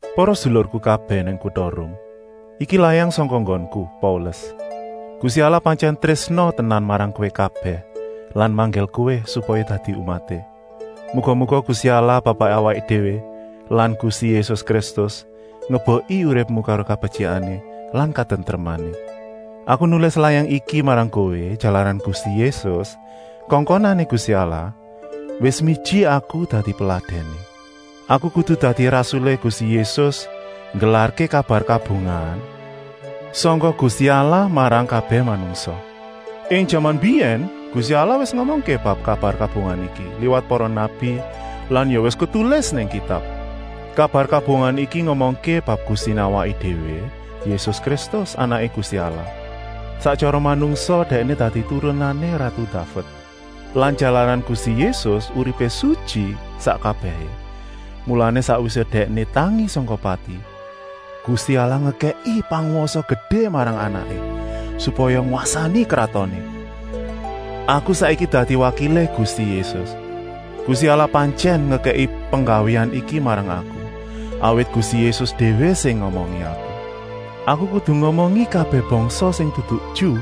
Para sedulurku kabèh nang kuta Rum, iki layang sangka nggonku, Paulus. Gusti Allah pantyèn trésna tenan marang kowé kabèh lan manggil kowé, supaya dadi umaté. Muga-muga Gusti Allah Bapaké awaké déwé lan Gusti Yésus Kristus ngebeki uripmu karo kabetyikané lan katentremané. Aku nulis layang iki marang kowé, jalaran Gusti Yésus, Kongkonané Gusti Allah, wis miji aku dadi peladèné. Aku kudu dadi rasulé Gusti Yésus nggelarké kabar kabungahan sangka Gusti Allah marang kabèh manungsa. Ing jaman mbiyèn Gusti Allah wis ngomongké bab kabar kabungahan iki liwat para nabi lan ya wis ketulis nang Kitab. Kabar kabungahan iki ngomongké bab Gustiné awaké déwé Yésus Kristus, Anaké Gusti Allah. Sak tyara manungsa Dèkné dadi turunané ratu Daved. Lan jalaran Gusti Yésus uripé sutyi sak kabèhé, mulané sakwisé Dèkné tangi sangka pati, Gusti Allah ngekèki pangwasa gedé marang Anaké, supaya ngwasani kratoné. Aku saiki dadi wakilé Gusti Yésus. Gusti Allah pantyèn ngekèki penggawéan iki marang aku, awit Gusti Yésus déwé sing ngomongi aku. Aku kudu ngomongi kabèh bangsa sing dudu Ju,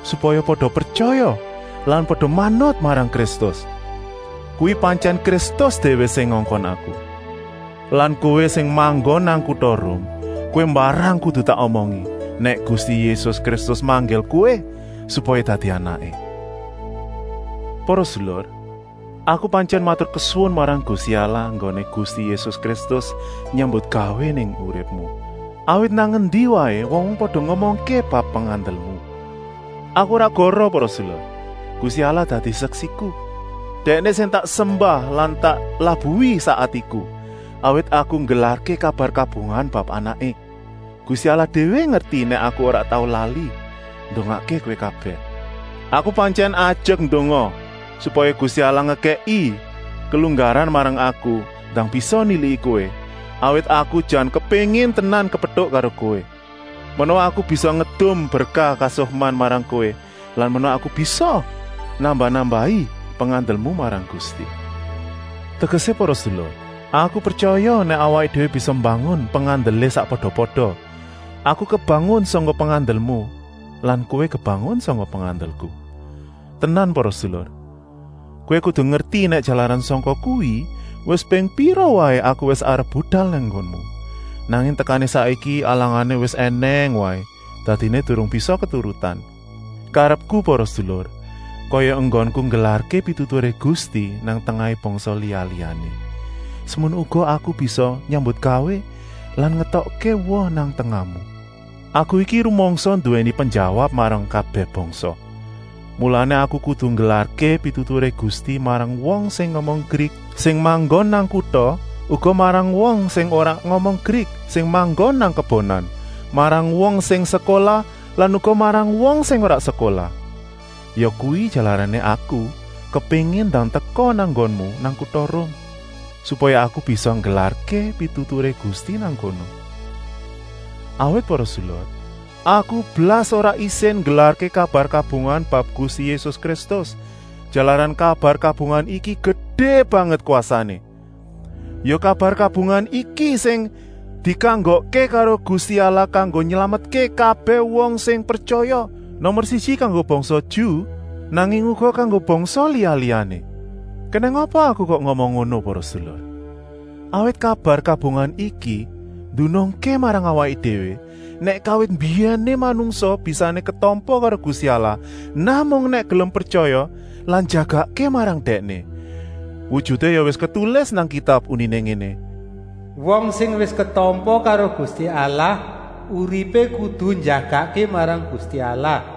supaya pada pretyaya lan pada manut marang Kristus. Kuwi pantyèn Kristus déwé sing ngongkon aku. Lan kowé sing manggon nang kuta Rum, kowé mbarang kudu tak omongi nèk Gusti Yésus Kristus manggil kowé supaya dadi anaké. Para sedulur, aku pantyèn maturkesuwun marang Gusti Allah enggoné Gusti Yésus Kristus nyambutgawé ing uripmu. Awit nang endi waé wong-wong pada ngomongké bab pengandelmu. Aku ora goroh para sedulur, Gusti Allah dadi seksiku. Dèkné sing tak sembah lan tak labuhi sak atiku, awit aku nggelarké kabar kabungahan bab Anaké. Gusti Allah déwé ngerti nèk aku ora tau lali ndongakké kowé kabèh. Aku pantyèn ajek ndonga, supaya Gusti Allah ngekèki kelunggaran marang aku ndang bisa niliki kowé, awit aku jan kepéngin tenan kepetuk karo kowé. Menawa aku bisa ngedum berkah kasukman marang kowé lan menawa aku bisa nambah-nambahi pengandelmu marang Gusti. Tegesé para sedulur, aku pretyaya nèk awaké déwé bisa mbangun pengandelé sakpada-pada, aku kebangun sangka pengandelmu lan kowé kebangun sangka pengandelku. Tenan para sedulur, kowé kudu ngerti nèk jalaran sangka kuwi wis ping pira waé aku wis arep budal nang nggonmu, nanging tekané saiki alangané wis ènèng waé, dadiné durung bisa keturutan. Karepku para sedulur, kaya enggonku nggelarké pituturé Gusti nang tengahé bangsa liya-liyané, semono uga aku bisa nyambutgawé lan ngetokké woh nang tengahmu. Aku iki rumangsa nduwèni penjawab marang kabèh bangsa, mulané aku kudu nggelarké pituturé Gusti marang wong sing ngomong Grik sing manggon nang kuta, uga marang wong sing ora ngomong Grik sing manggon nang kebonan, marang wong sing sekolah lan uga marang wong sing ora sekolah. Yakuwi jalarané aku kepéngin ndang teka nang nggonmu nang kuta Rum, supaya aku bisa nggelarké pituturé Gusti nang kono. Awit para sedulur, aku blas ora isin nggelarké kabar kabungahan bab Gusti Yésus Kristus, jalaran kabar kabungahan iki gedé banget kwasané. Ya kabar kabungahan iki sing dikanggokké karo Gusti Allah kanggo nylametké kabèh wong sing pretyaya, nomer siji kanggo bangsa Ju, nanging uga kanggo bangsa liya-liyané. Kenèng apa aku kok ngomong ngono para sedulur? Awit kabar kabungahan iki ndunungké marang awaké déwé, nèk kawit mbiyèné manungsa bisané ketampa karo Gusti Allah namung nèk gelem pretyaya lan njagakké marang Dèkné. Wujuté ya wis ketulis nang Kitab uniné ngéné: “Wong sing wis ketampa karo Gusti Allah uripé kudu njagakké marang Gusti Allah.”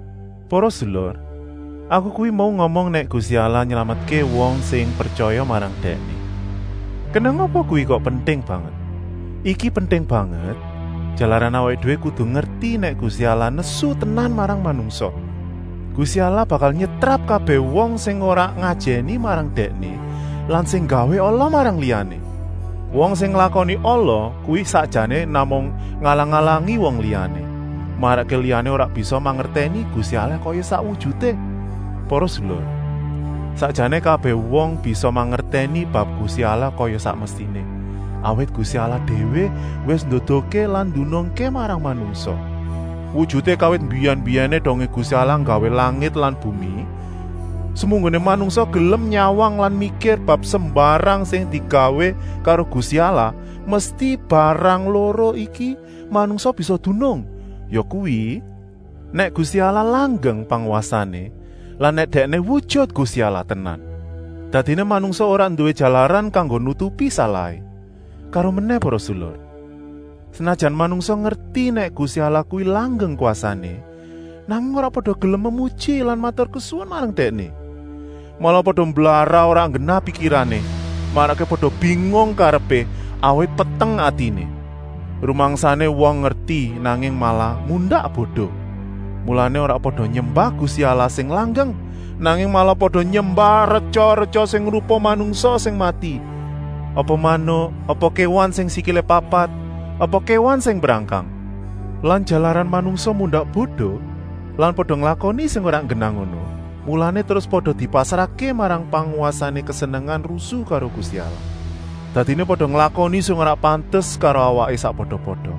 Para sedulur, aku kuwi mau ngomong nèk Gusti Allah nylametké wong sing pretyaya marang Dèkné. Kenèng apa kuwi kok penting banget? Iki penting banget, jalaran awaké déwé kudu ngerti nèk Gusti Allah nesu tenan marang manungsa. Gusti Allah bakal nyetrap kabèh wong sing ora ngajèni marang Dèkné lan sing nggawé ala marang liyané. Wong sing nglakoni ala kuwi sakjané namung ngalang-alangi wong liyané, marakké liyané ora bisa mangertèni Gusti Allah kaya sak wujuté. Para sedulur, sakjané kabèh wong bisa mangertèni bab Gusti Allah kaya sak mestiné, awit Gusti Allah déwé wis nduduhké lan ndunungké marang manungsa. Wujuté kawit mbiyèn-mbiyèné, dongé Gusti Allah nggawé langit lan bumi, semunggoné manungsa gelem nyawang lan mikir bab sembarang sing digawé karo Gusti Allah, mesti barang loro iki manungsa bisa dunung, yakuwi, nèk Gusti Allah langgeng pangwasané lan nèk Dèkné wujut Gusti Allah tenan. Dadiné manungsa ora nduwé jalaran kanggo nutupi salahé. Karomenèh para sedulur, senajan manungsa ngerti nèk Gusti Allah kuwi langgeng kwasané, nanging ora pada gelem memuji lan maturkesuwun marang Dèkné. Malah pada mblarah ora nggenah pikirané, marakké pada bingung karepé, awit peteng atiné. Rumangsané wong ngerti, nanging malah mundak bodo. Mulané ora pada nyembah Gusti Allah sing langgeng, nanging malah pada nyembah retya-retya sing rupa manungsa sing mati, apa manuk, apa kéwan sing sikilé papat, apa kéwan sing mbrangkang. Lan jalaran manungsa mundak bodo lan pada nglakoni sing ora nggenah ngono, mulané terus pada dipasrahké marang pangwasané kesenengan rusu karo Gusti Allah. Dadiné pada nglakoni sing ora pantes karo awaké sakpada-pada.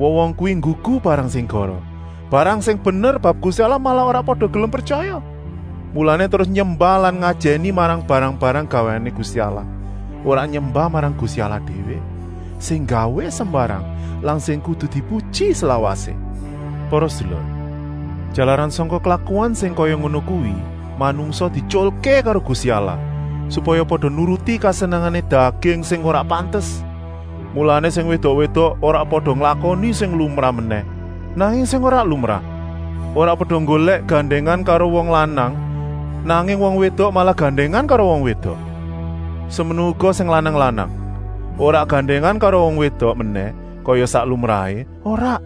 Wong-wong kuwi nggugu barang sing goroh, barang sing bener bab Gusti Allah malah ora pada gelem pretyaya. Mulané terus nyembah lan ngajèni marang barang-barang gawéané Gusti Allah, ora nyembah marang Gusti Allah déwé, sing nggawé sembarang lan sing kudu dipuji slawasé. Amèn. Para sedulur, jalaran sangka klakuan sing kaya ngono kuwi, manungsa dietyulké karo Gusti Allah, supaya pada nuruti kesenengané daging sing ora pantes. Mulané sing wédok-wédok ora pada nglakoni sing lumrah menèh, nanging sing ora lumrah. Ora pada nggolèk gandèngan karo wong lanang, nanging wong wédok malah gandèngan karo wong wédok. Semono uga sing lanang-lanang. Ora gandèngan karo wong wédok menèh kaya sak lumrahé, ora,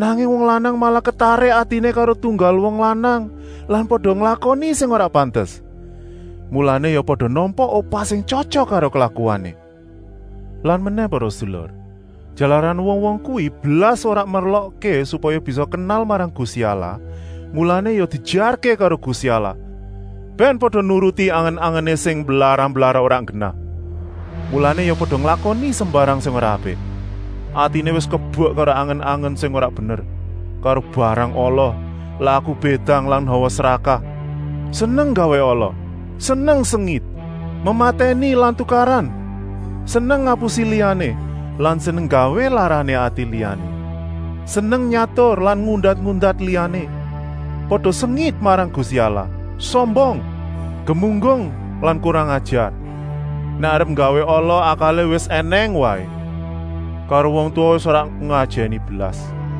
nanging wong lanang malah ketarik atiné karo tunggal wong lanang lan pada nglakoni sing ora pantes. Mulané ya pada nampa upah sing tyotyok karo klakuané. Lan menèh para sedulur, jalaran wong-wong kuwi blas ora merlokké supaya bisa kenal marang Gusti Allah, mulané ya diejarké karo Gusti Allah, bèn pada nuruti angen-angené sing mblarah-mblarah ora nggenah. Mulané ya pada nglakoni sembarang sing ora apik. Atiné wis kebek karo angen-angen sing ora bener, karo barang ala, laku bédang lan hawa srakah. Seneng nggawé ala, seneng sengit, mematèni lan tukaran. Seneng ngapusi liyané lan seneng nggawé larané ati liyané. Seneng nyatur lan ngundat-undat liyané. Pada sengit marang Gusti Allah, sombong, gemunggung lan kurang-ajar. Nèk arep nggawé ala akalé wis ènèng waé. Karo wong tuwa wis ora ngajèni blas.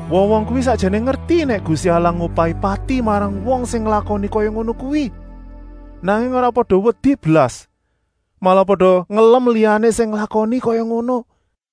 Wong-wong kuwi sakjané ngerti nèk Gusti Allah ngupahi pati marang wong sing nglakoni kaya ngono kuwi, nanging ora pada wedi blas, malah pada ngelem liyané sing nglakoni kaya ngono.